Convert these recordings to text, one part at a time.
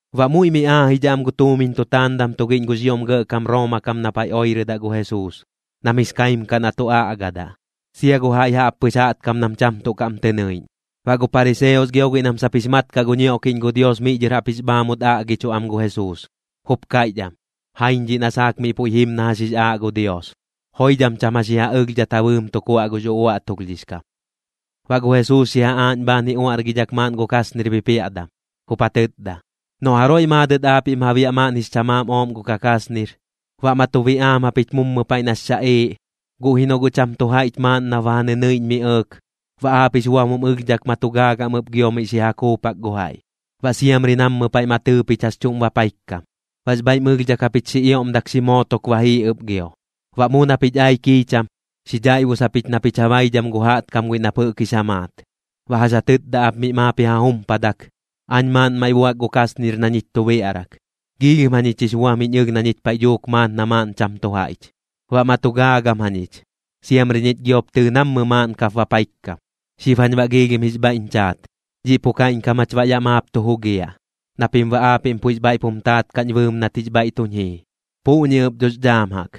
Baꞌ muiꞌ mi aajidhaꞌ am gu tuumiñ tu taandam tugiꞌñ gux ioꞌm gɇꞌkam Rooma kam na paiꞌ oirɨdaꞌ gu Jesuus, nam jix kaim kaꞌ na tu aꞌgadaꞌ, sia gu jaiꞌ jaꞌppɨx jaꞌtkam nam cham tuꞌ kaꞌm tɨ nɨiꞌñ. Baꞌ gu pariseos gio guiꞌ nam sap jix mat kaꞌ gu ñioꞌkiꞌñ gu Dios miꞌ dhɨr jaꞌp jix bhaamut aꞌgichuꞌ am gu Jesuus, jup kaiꞌch am: ―Jaiñ dhiꞌ na saak miꞌ puiꞌ jim na jax jix aaꞌ gu Dios, joidham cham jax ji ja ɨlhdhat ja bɨɨm tu kuaꞌ gux uꞌuaꞌtulhdhix kam. Baꞌ gu Jesuus xi ja aaꞌñ bhaan ji uaꞌrgidhak maaꞌn gu kasnir bipiaꞌdam, jup ja tɨtda: ―Noꞌ jaroiꞌ maadɨt aapiꞌm ja biaꞌ maaꞌn jix chamaam ooꞌm gu kakasnir, baꞌ ma tu biꞌaam japich mummɨ paiꞌ nax xaꞌiiꞌ, guꞌ ji noꞌ guꞌ cham tu jaiꞌch maaꞌn nap ba ja nɨnɨiꞌñ mi ɇɇk, baꞌ aap jix buam jum ɨlhdhak ma tu gaagam ɨp gio miꞌ xi ja kuupak gu jaiꞌ. Baꞌ siamri nammɨ paiꞌ ma tɨɨ pich jax chuꞌm bapaikkam, baꞌx bhaiꞌm ɨlhdhak japich xi ioꞌmdak xi mootok ba jii ɨp gio. Baꞌ mu na pich ai kiicham, xi dhaiꞌbus japich na pich ja baidham gu jaꞌtkam guiꞌ nap jɨꞌk jix ja maat, baꞌ jax ja tɨtda ap miꞌ maap ji ja jumpadak: “Aañ maaꞌn maiꞌ buak gu kasnir na ñich tu biaꞌrak. Giilhim jañich jix buam jiñ ɨlh na ñich paiꞌ dhuuk maat na maaꞌn cham tu jaiꞌch. Baꞌ ma tu gaagam jañich, siamri ñich giop tɨɨ nammɨni maaꞌn kap bapaikkam. Xib jañ baꞌ giilhim jix bhaiꞌñ chaat. Dhiꞌ pu kaiꞌñkam jach baꞌ yaꞌ maap tu jugiaꞌ, na pim baꞌ aapiꞌm puiꞌx bhaiꞌp jum taat kaꞌñ bɨɨm nat jix bhaiꞌ tuñ jii.” Puꞌñi ɨp dhox dhaam jaꞌk,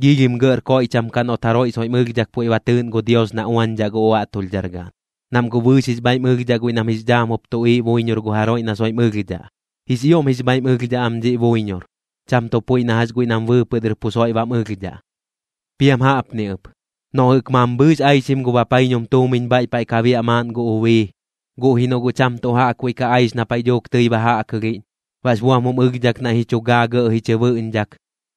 giilhim gɇꞌr koiꞌcham kaꞌ noꞌt jaroiꞌ soiꞌm ɨlhdhak puiꞌ ba tɨɨꞌn gu Dios na uañdhaꞌ gu uaꞌtulhdhar gaꞌn, nam guꞌ bɨɨx jix bhaiꞌm ɨlhdhaꞌ guiꞌ nam jix dhaam jup tuꞌiiꞌ buiñor gu jaroiꞌ na soiꞌm ɨlhdhaꞌ. Jix ioꞌm jix bhaiꞌm ɨlhdhaꞌ am dhiꞌ buiñor, cham tuꞌ puiꞌ na jax guiꞌ nam bɨɨpɨꞌ dɨr pu soiꞌ bam ɨlhdhaꞌ. ’Piam jaꞌpni ɨp. Noꞌ jɨꞌk mambhɨɨx aixim gu bapaiñum tuumiñ bhaiꞌ paiꞌ ka biaꞌ maaꞌn gu ubii, guꞌ ji noꞌ guꞌ cham tuꞌ jaꞌkbuiꞌ ka aix na paiꞌ dhuuk tɨi ba jaꞌkɨlhiꞌñ, baꞌx buam jum ɨlhdhak naiꞌ ji chu gaa gɇꞌ ji chɨ bɨꞌñdhak,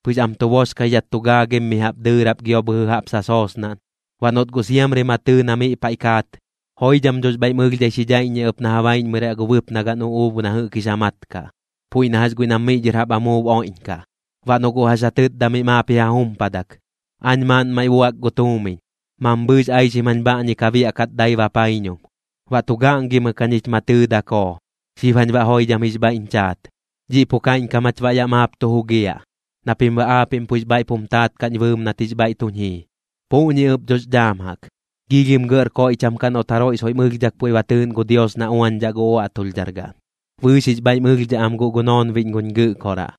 pɨx am tu boxkaidhat tu gaagim mi jaꞌp dɨɨrap gio bhɨjɨ jaꞌp sasoosnaꞌn. Baꞌ noꞌt guꞌ siamri ma tɨɨ na miꞌ paiꞌ kaat, joidham dhox bhaiꞌm ɨlhdhai xi dhaiꞌññiaꞌ ɨp na ja baiꞌñmɨraꞌ gu bɨpnagaꞌn uꞌuub guiꞌ na jɨꞌk jix ja mat kaꞌ, puiꞌ na jax guiꞌ nam miꞌ dhɨr jaꞌp amuub oiꞌñkaꞌ. Baꞌ noꞌ guꞌ jax ja tɨtdaꞌ miꞌ maap ji ja jumpadak: “Aañ maaꞌn maiꞌ buak gu tuumiñ, mambhɨɨx aixim jañ bhaꞌñi ka biaꞌkat dai bapaiñum. Baꞌ tu gaꞌngimɨk jañich ma tɨɨ dakoo. Xib jañ baꞌ joidham jix bhaiꞌñ chaat. Dhiꞌ pu kaiꞌñkam jach baꞌ yaꞌ maap tu jugiaꞌ, na pim baꞌ aapiꞌm puiꞌx bhaiꞌp jum taat kaꞌñ bɨɨm nat jix bhaiꞌ tuñ jii.” Puꞌñi ɨp dhox dhaam jaꞌk, giilhim gɇꞌr koiꞌcham kaꞌ noꞌt jaroiꞌ soiꞌm ɨlhdhak puiꞌ ba tɨɨꞌn gu Dios na uañdhaꞌ gu uaꞌtulhdhar gaꞌn. Bɨɨx jix bhaiꞌm ɨlhdhaꞌ am guꞌ gu noonbiꞌñ guñ Gɨꞌkoraꞌ.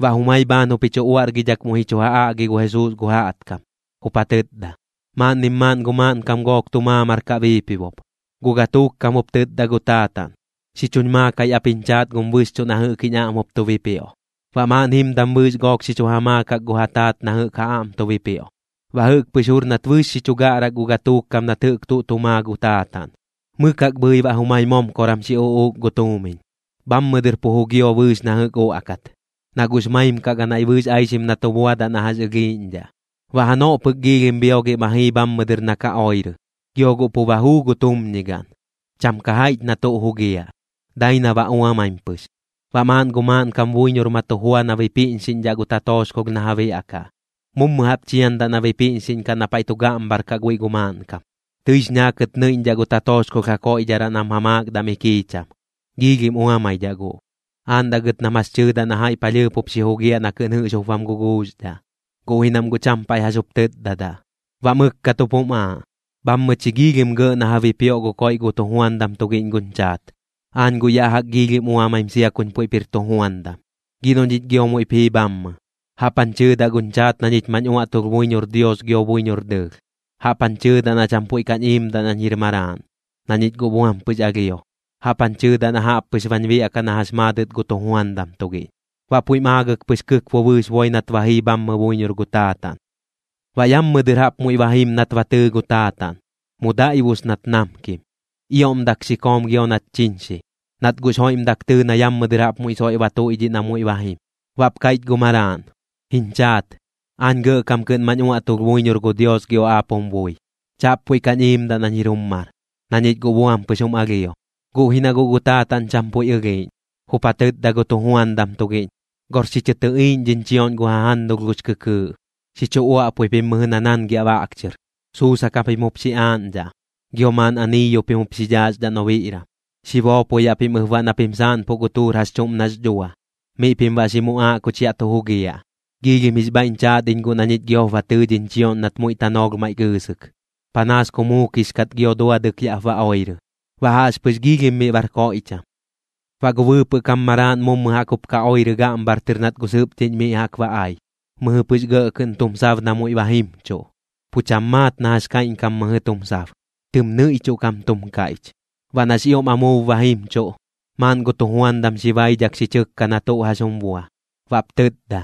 Baꞌ jumai bhaan jup ji chu uaꞌrgidhak muiꞌ ji chu ja aꞌgi gu Jesuus gu jaꞌtkam, jup ja tɨtda: ―Maaꞌnnim maaꞌn gu maaꞌnkam gook tu maamar kaꞌ biipibop. Gu gatuuk kam jup tɨtda gu taataꞌn: “Xi chuñ maakai ap jiñ chaat gum bɨxchuꞌ na jɨꞌk jiñ aꞌm jup tu bipioꞌ.” Baꞌ maaꞌn jimdam bɨɨx gook xi chu ja maakak gu ja taat na jɨꞌk ja aꞌm tu bipioꞌ. Baꞌ jɨꞌk pɨx jur nat bɨɨx xi chu gaꞌrak gu gatuuk kam nat jɨꞌk tuꞌ tu maa gu taataꞌn, mɨk jaꞌk bhɨi baꞌ jumai momkoram xi uꞌuuk gu tuumiñ. Bhammɨ dɨr pu jugio bɨɨx na jɨꞌk uaꞌkat, na guꞌx maim kaꞌ ganaiꞌ bɨɨx aixim na tu buadaꞌ na jax ɨlhiiꞌñdhaꞌ. Baꞌ janoꞌ pɨk giilhim bhiogiꞌ ma jii bhammɨ dɨr na ka oirɨ, gio guꞌ pu ba juu gu tumñigaꞌn. Cham ka jaiꞌch na tuꞌ jugiaꞌ, dai na ba uamaim pɨx. Baꞌ maaꞌn gu maaꞌnkam buiñor ma tu jua na bipiꞌñxiꞌñdhaꞌ gu tatooxkolh na ja biaꞌkaꞌ. Mummɨ jaꞌp chiandaꞌ na bipiꞌñxiꞌñkaꞌ na paiꞌ tu gaꞌmbhar kaꞌ guiꞌ gu maaꞌnkam. Tɨix ñaakɨt nɨiꞌñdhaꞌ gu tatooxkolh ja koiꞌdharaꞌ nam ja maakdaꞌ mi kiicham, giilhim uamaidhaꞌ guꞌ. Aaꞌndaꞌ gɨt nam jax tɨɨdaꞌ na jaiꞌ palhɨɨp jup xi jugiaꞌ na kɨꞌn jɨꞌx jup bam guguuxdhaꞌ, guꞌ ji nam guꞌ cham paiꞌ jax jup tɨtdadaꞌ. Baꞌ mɨkkat jup jum aaꞌ: “Bhammɨ chi giilhim gɇꞌ na ja bipioꞌ gu koiꞌ gu tujuandam tugiꞌñ guñ chaat, aañ guꞌ yaꞌ jaꞌk giilhim uamaim sia kuñ puiꞌp jir tujuandam. Gi noꞌ ñich gio muiꞌp jii bhammɨ, jaꞌp jañ chɨɨdaꞌ guñ chaat na ñich mañ uaꞌtulh buiñor Dios gio buiñor dɨɨlh. Jaꞌp jañ chɨɨdaꞌ na cham puiꞌ kañ iimdaꞌ nañ jir maraaꞌn, na ñich guꞌ buam pɨx alhio. Jaꞌp jañ chɨɨdaꞌ na jaꞌp pɨx bañ biaꞌkaꞌ na jax maadɨt gu tujuandam tugiꞌñ.” Baꞌ puiꞌm aagɨk pɨx kɨkbo bɨɨx boi nat ba jii bhammɨ buiñor gu taataꞌn. ’Baꞌ yammɨ dɨr jaꞌp muiꞌ ba jim nat ba tɨɨ gu taataꞌn, mu daiꞌbus nat namkim. Ioꞌmdak xi koom gio nat chiñxi, nat guꞌx joiꞌmdak tɨɨ na yammɨ dɨr jaꞌp muiꞌ soiꞌ ba tuiꞌdhiꞌ na muiꞌ ba jim. Baꞌp kaiꞌch gu maraaꞌn: “Jiñ chaat, aañ gɇꞌkam kɨꞌn mañ uaꞌtulh buiñor gu Dios gio aap jum bui. Chaꞌp puiꞌ kañ iimdaꞌ nañ jir jum mar, na ñich guꞌ buam pɨx jum alhio.” Guꞌ ji na guꞌ gu taataꞌn cham puiꞌ ɨlhiiꞌñ, jup ja tɨtda gu tujuandam tugiꞌñ: “Gor xi chɨ tɨꞌiiꞌñ dhiñ chioꞌñ gu jajannulh gux kɨkɨɨꞌ, xi chu uaꞌpui pim mɨjɨ na naangiaꞌ baꞌk chɨr. Suusak japim jup xi aaꞌñdhaꞌ, gio maaꞌn aniiyu pim jup xi dhaaxdhaꞌ nobiꞌram. Xi boopoyaꞌ pim ɨp baꞌ na pim saaꞌnpuꞌ gu tuur jax chuꞌm nax dhua. Miꞌ pim baꞌ xi muꞌaaꞌ kuch yaꞌ tu jugiaꞌ. Giilhim jix bhaiꞌñ chaat iñ guꞌ na ñich giop ba tɨɨ dhiñ chioꞌñ nat muiꞌ tanoolh maiꞌ gɨɨsɨk, panaas ku muukix kat gio duadɨk yaꞌp ba oirɨ.” Baꞌ jaꞌxpɨx giilhim miꞌ bar koiꞌcham. ’Baꞌ gu bɨɨpɨꞌ kam maraaꞌn mummɨ jaꞌk jup ka oirɨ gaꞌmbhar tɨr nat gu sɨpdhiꞌñ miꞌ jaꞌk ba ai. Mɨjɨ pɨx gɇꞌ kɨꞌn tum sab na muiꞌ ba jimchuꞌ, pu cham maat na jax kaiꞌñkam mɨjɨ tum sab, tɨm nɨiꞌchuꞌ kam tum kaiꞌch. Baꞌ nax ioꞌm amuub ba jimchuꞌ, maaꞌn gu tujuandam xi baidhak xi chɨkka na tuꞌ jax jum bua. Baꞌp tɨtda: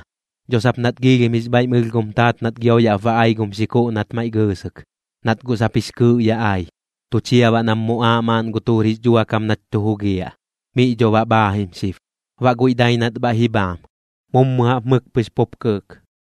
“Dho sap nat giilhim jix bhaiꞌm ɨlh gum taat nat gio yaꞌp ba ai gum xikuꞌ nat maiꞌ gɨɨsɨk, nat guꞌ sap jix kɨɨꞌ ya ai. Tu chia baꞌ nam muꞌaaꞌ maaꞌn gu tuur jix dhuakam nach tu jugiaꞌ. Miꞌ dho baꞌ bhaajim xib.” Baꞌ guiꞌ dai nat bhaiꞌ ji bhaam. Mummɨ jaꞌp mɨk pɨx pup kɨɨk.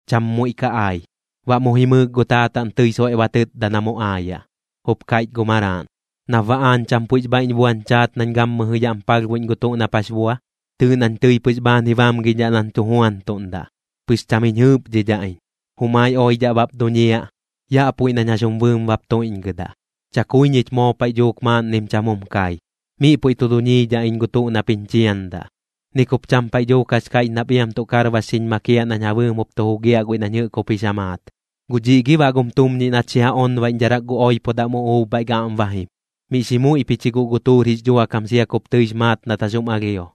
Cham muiꞌ ka ai. Baꞌ mu jimɨɨk gu taataꞌn tɨi soiꞌ ba tɨtda na mu aayaꞌ. Jup kaiꞌch gu maraaꞌn: “¿Nap baꞌ aañ cham puiꞌx bhaiꞌñ buañ chaat nañ gammɨjɨ yaꞌm palhbuiꞌñ gu tuꞌ nap jax bua? Tɨɨꞌ nañ tɨi pɨx bhaan ji bamgidhaꞌ nañ tu juantuꞌndaꞌ, pɨx cham jiñ jɨɨpdhidhaꞌ iñ. Jumai oidhaꞌ bap duñiaꞌ, yaꞌ puiꞌ nañ jax jum bɨɨm bap tuiꞌñgɨdaꞌ. Chakui ñich moo paiꞌ dhuuk maaꞌnnim cham jum kai. Miꞌ puiꞌ tu duñiidhaꞌ iñ gu tuꞌ nap jiñ chiandaꞌ. Ni kup cham paiꞌ dhuuk jax kaiꞌch nap iam tuꞌ karbax xiñ makiaꞌ nañ ja bɨɨm jup tu jugiaꞌ guiꞌ nañ jɨꞌk jup jix ja maat. Guꞌ dhiꞌ gi baꞌ gum tumñiꞌ nat xi ja onbaiꞌñdharak gu oipodam uꞌuub bhaiꞌ gaꞌm ba jim, miꞌ xi muiꞌ pich ji guꞌ gu tuur jix dhuakam sia kup tɨix maat nat jax jum alhio.”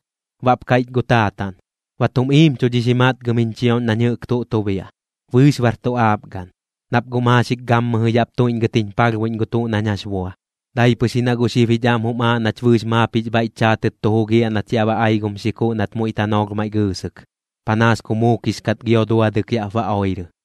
Baꞌp kaiꞌch gu taataꞌn: “Ba tum iimchudhix ji matgɨm jiñ chioꞌñ nañ jɨꞌk tuꞌ tu biaꞌ, bɨɨx bar tu aap gaꞌn, nap guꞌ maaxik gammɨjɨ yaꞌp tuiꞌñgɨt jiñ palhbuiꞌñ gu tuꞌ nañ jax bua. Dai pɨx ji na guꞌ xib jich aꞌm jum aaꞌ nach bɨɨx maap jix bhaiꞌch chaatɨt tu jugiaꞌ nat yaꞌ ba ai gum xikuꞌ nat muiꞌ tanoolh maiꞌ gɨɨsɨk, panaas ku muukix kat gio duadɨk yaꞌp ba oirɨ.”